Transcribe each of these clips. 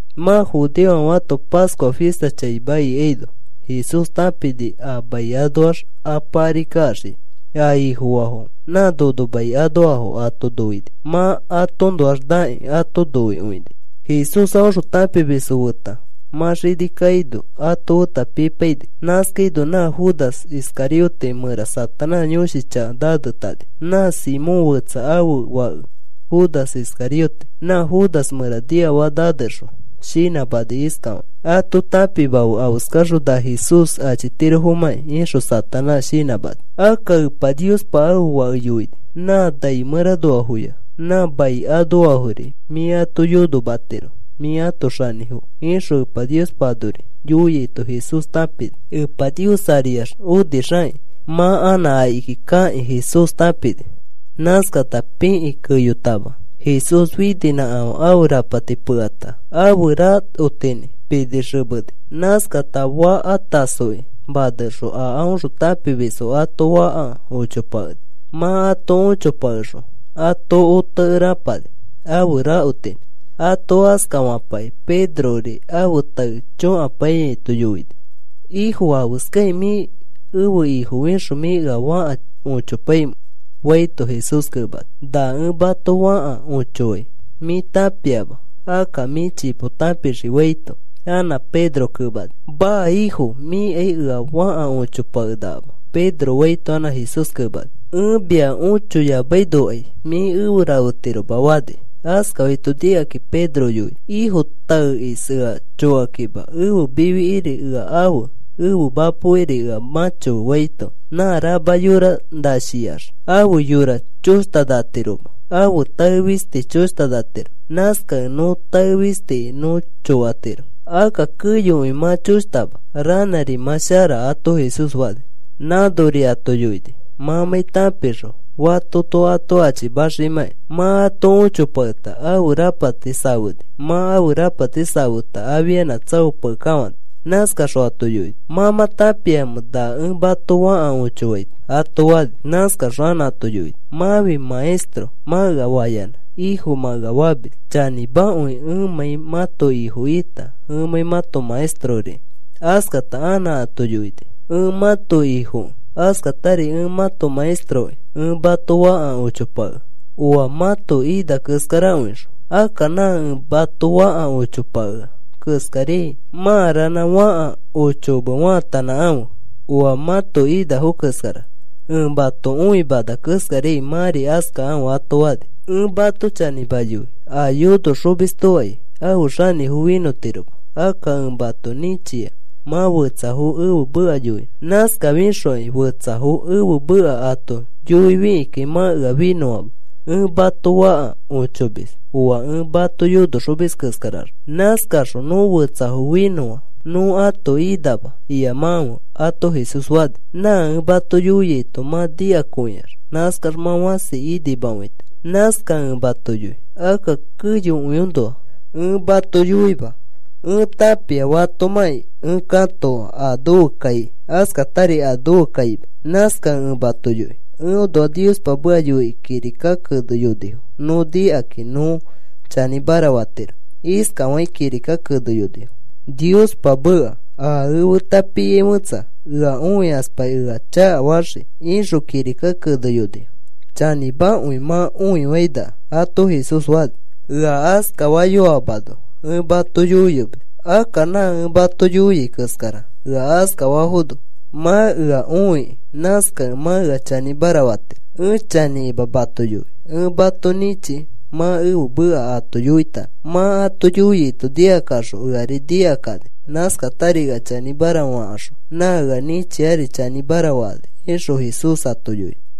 Mã judeofãfe ãto Pascua fista chaima ikaino Jesús tãpini a mai anoax Apa ari kaxiai. A Ifofaafo nã nono mai anoafo ato noini. Mã atoõnoax nakĩ ato noikõini. Jesús aõxõ tãpimisfo feta mã xini kaino ato feta pipaini. Nãskaino nã Judas Iscariote mẽra Satanás yõshi chaka nanetani. Nã Simón fetsa ãfe fake Judas Iscariote. Nã Judas mẽra niafaka nanexõ shinãmani iskafakĩ: “Ato tãpimafe afeskaxõ na Jesús achitirofomãki,” ixõ Satanás shinãmani. Akka Epa Niospa ãfe Fake yoini: “Nã nai mẽranoafoya nã mai anoafori mĩ ato yonomatiro. Mĩ ãto xanĩfo,” ixõ Epa Niospa anori yoiaito Jesús tãpini. Epa Nios ariax onixakĩ mã anã akiki kakĩ Jesús tãpini. Nãskata pikĩ keyotama Jesús fininãkafã ãfe rapati pekata ãfe rakotinĩ pinixemeni. Nãskata faka tasoki manexõ a aõxõ tãpimisfo ato fãka ochopakeni. Mã ato ochopakexõ ato otekere apani ãfe rakotinĩ. Ato askafapakĩ Pedrori ãfe tae chokapaiyaito yoini: “Ifo, ¿afeskakĩ mĩ ẽfe Ifo fixõ mĩ ea fãka ochopaimẽ?” faito, Jesús kemani: “Na ẽ mato fãka ochofai mĩ tãpiama. Akka mĩ chipo tãpixii,” faito, anã Pedro kemani: “Maa, Ifo, mĩakai ea fãka õchopakenakama,” Pedro faito, anã Jesús kemani: “Ẽ mia õchoyamainokai mĩ efe rafetiroma,” fani. Askafaito nikakĩ Pedro yoini: “Ifo, taekis ea chokakima ẽfe mifikiri ea afe, ẽfe mapokiri ea mãchofe,” faito, “Nã rama yora nashiax ãfe yora choshtanatiroma, ãfe tae fisti choshtanatiro. Nãskakẽ nõ tae fistiki nõ chokatiro. Akka keyokõi mã choshtama, ranãri mã shara,” ato Jesús fani. Nãnori ato yoini mãmãi tãpixõ fatoto ato achimaximãkai. Mã ato õchopaketa ãfe rapati safeni. Mã ãfe rapati safeta afianã tsaopakekafãni. Nãskaxõ ato yoini: “¿Mã mã tãpiamẽ na ẽ mato fãka õchofaito?” ato fani. Nãskaxõ anã ato yoini: “Mãfi, ‘Maestro,’ mã ea fayanã, ‘Ifo,’ mã ea famis. Chanĩmakõi ẽmãi mãto Ifo ita ẽ mãto maestrori.” Askata anã ato yoini: “Ẽ mãto Ifokĩ, askatari ẽ mãto maestrokĩ ẽ mato fãka õchopakea oa mãto ina keskarakõixõ. Akka nã ẽ mato fãka ochopakea keskariai mã ranã fãka õchokome faatanãkãfe oa mãto inafo keskarax. Ẽ mato õimana keskariai mãri askakãfe,” ato fani. “Ẽ mato chanĩma yoi. A yonoxomistokai ãfe xanĩfo finõtiroma. Akka ẽ mato nĩchia mã fetsafo ẽfe meka yoinõ. Nãskafixokai fetsafo ẽfe meka ato yoifikĩkai mã ea finõama. Ẽ mato fãka õchomis oa ẽ mato yonoxomis keskaraxõ. Nãskaxõ, ‘Nõ fetsafo finõa, nõ ãto inama,’ iyamakãfe,” ato Jesús fani. “Na ẽ mato yoiaito mã nikakõiax, nãskax mã fãsi inimakõitiro. “Nãskakẽ ẽ mato yoi, akka keyokõiõnoa ẽ mato yoima. Ẽ tãpia fatomãkĩ ẽ katoa a nofe kai, askatari a nofe kaima. Nãskakẽ ẽ mato yoi, eõnoa Niospa meka yoikĩ kirika keneyonifo nõ nikakĩ nõ chanĩmara fatiro. Iskafakĩ kirika keneyonifo, Niospa meka: ‘A feta piai fẽtsa ea õikaspakĩ ea chakafaxii,’ ixõ kirika keneyonifo. Chanĩmakõi mã õifainaka,” ato Jesús fani. “Ea askafayoamano ẽ mato yoiyomis. Akka nã ẽ mato yoiai keskara ea askafafono mã ea õikĩ, nãskakẽ mã ea chanĩmara fatiro. Ẽ chanĩkima mato yoi ẽ mato nĩchi mã ẽfe meka ato yoitanõ. Mã ato yoiaito nikakaxõ eari nikakani. Nãskatari ea chanĩmara fakaxõ nã ea nĩchiari chanĩmara fakani,” ixõ Jesús ato yoini.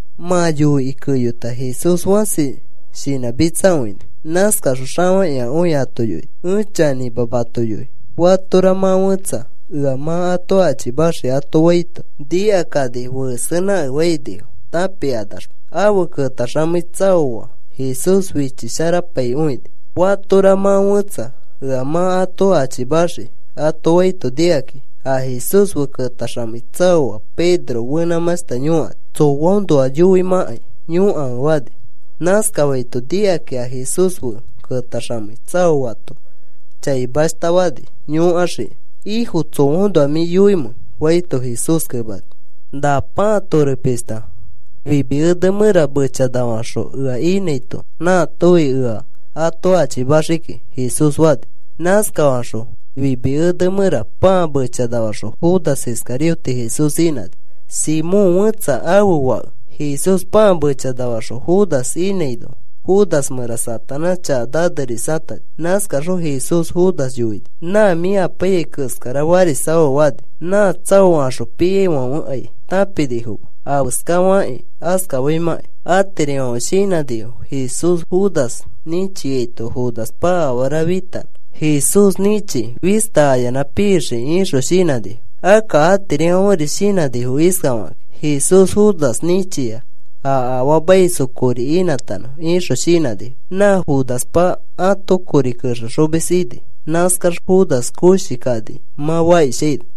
Mã yoikĩ keyota Jesús fãsi shinãmitsakõini. Nãskaxõ xafakĩakõi ato yoini: “Ẽ chanĩma mato yoi. Fatora mã fẽtsa ea mã ato achimaxii,” ato faito, nikakani fesenãkefainifo tãpikanaxma. Afe ketaxamei tsaoa Jesús fichisharapaikõini. “Fatora mã fẽtsa ea mã ato achimaxii,” ato faito nikakĩ a Jesús fe ketaxamei tsaoa Pedro fenãmãshta yõkani: “Tsoaõnoa yoimãkai, yõkafe,” fani. Nãskafaito nikakĩ a Jesús fe ketaxamei tsaoato chaimashta fani yõkaxikĩ: “Ifo, ¿tsoaõnoa mĩ yoimẽ?” faito, Jesús kemani: “Na pãa tore pishta nami ene mẽra mechanafaxõ ẽ inãito nãatofi ea ato achimaxii kiki,” Jesús fani. Nãskafaxõ nami ene mẽra pãa mechanafaxõ Judas Iscariote Jesús inãni, Simón fetsa ãfe fake. Jesús pãa mechanafaxõ Judas inãino Judas mẽra Satanás chaka nanerisatani. Nãskaxõ Jesús Judas yoini: “Nã mĩ apaiyai keskara farisafafe,” fani. Nã tsaokaxõ piaifãfekai tãpinifoma afeska fakĩ askafaimãkai. Atirifãfe shinãnifo: “Jesús Judas nĩchiaito Judaspa afara fitanõ Jesús nĩchi fista ayanã pixikĩ,” ixõ shinãnifo. Akka atirifãferi shinãnifo iskafakĩ: “Jesús Judas nĩchia a afaamaisfo kori inãtanõ,” ixõ shinãnifo. Nã Judaspa ãto kori kexexomis ini. Nãskax Judas koshi kani mã fakishaino.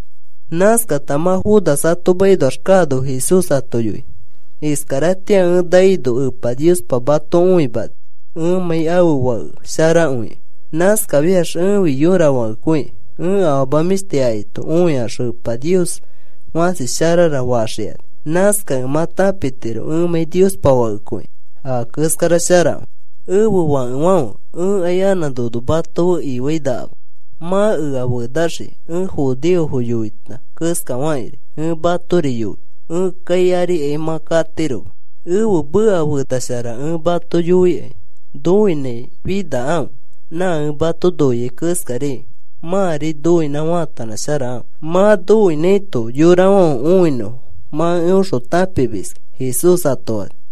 Nãskata mã Judas ato makinoax kaano Jesús ato yoini: “Iskaratĩa ẽ naino Epa Niospa mato õimani ẽmãi ãfe Fake sharakõikẽ. Nãskafiax ẽfi yõra fakekõi. Ẽ afama mĩshti akaito õikaxõ, ‘Epa Nios fãsi sharara,’ faxikani. Nãskakẽ mã tãpitiro ẽmãi Niospa Fakekõikẽ a keskara sharakõi. “Ẽfe fakefãfe, ẽkai anã nono mato fe ifĩinakama. Mã ea fenaxii. Ẽ judeofo yoita keskafakĩri ẽ matori yoi. Ẽ kai arikai mã katiroma. Ẽfe meka fenashara ẽ mato yoikai, noinãi finakãfe. Nã ẽ mato noiai keskariai mãri noinã faatanãsharakãfe. Mã noinãiyaito yorafãfe õinõfo mã eõxõ tãpimiski,” Jesús ato fani.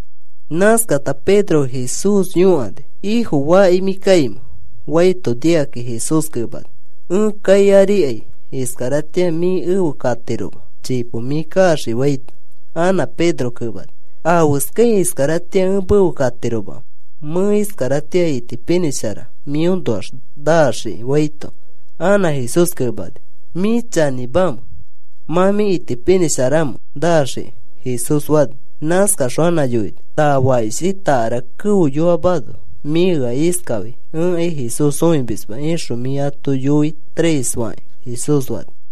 Nãskata Pedro Jesús yõkani: “Ifo, ¿faki mĩ kaimẽ?” faito, nikakĩ Jesús kemani: “Ẽ kai arikai iskaratĩa mĩ efe kayotiroma. Chipo mĩ kaxii,” faito, anã Pedro kemani: “¿Afeskai iskaratĩa ẽ mefe katiromamẽ? Mẽ iskaratĩa itipinĩshara mĩõnoax naxikĩ,” faito, anã Jesús kemani: “¿Mĩ chanĩmamẽ? ¿Mã mĩ itipinĩsharamẽ naxikĩ?” Jesús fani. Nãskaxõ anã yoini: “Na fakishi takara keoyoamano mĩ ea iskafai: ‘Ẽkai Jesús õimisma,’ ixõ mĩ ato yoi tres fakĩ,” Jesús fani.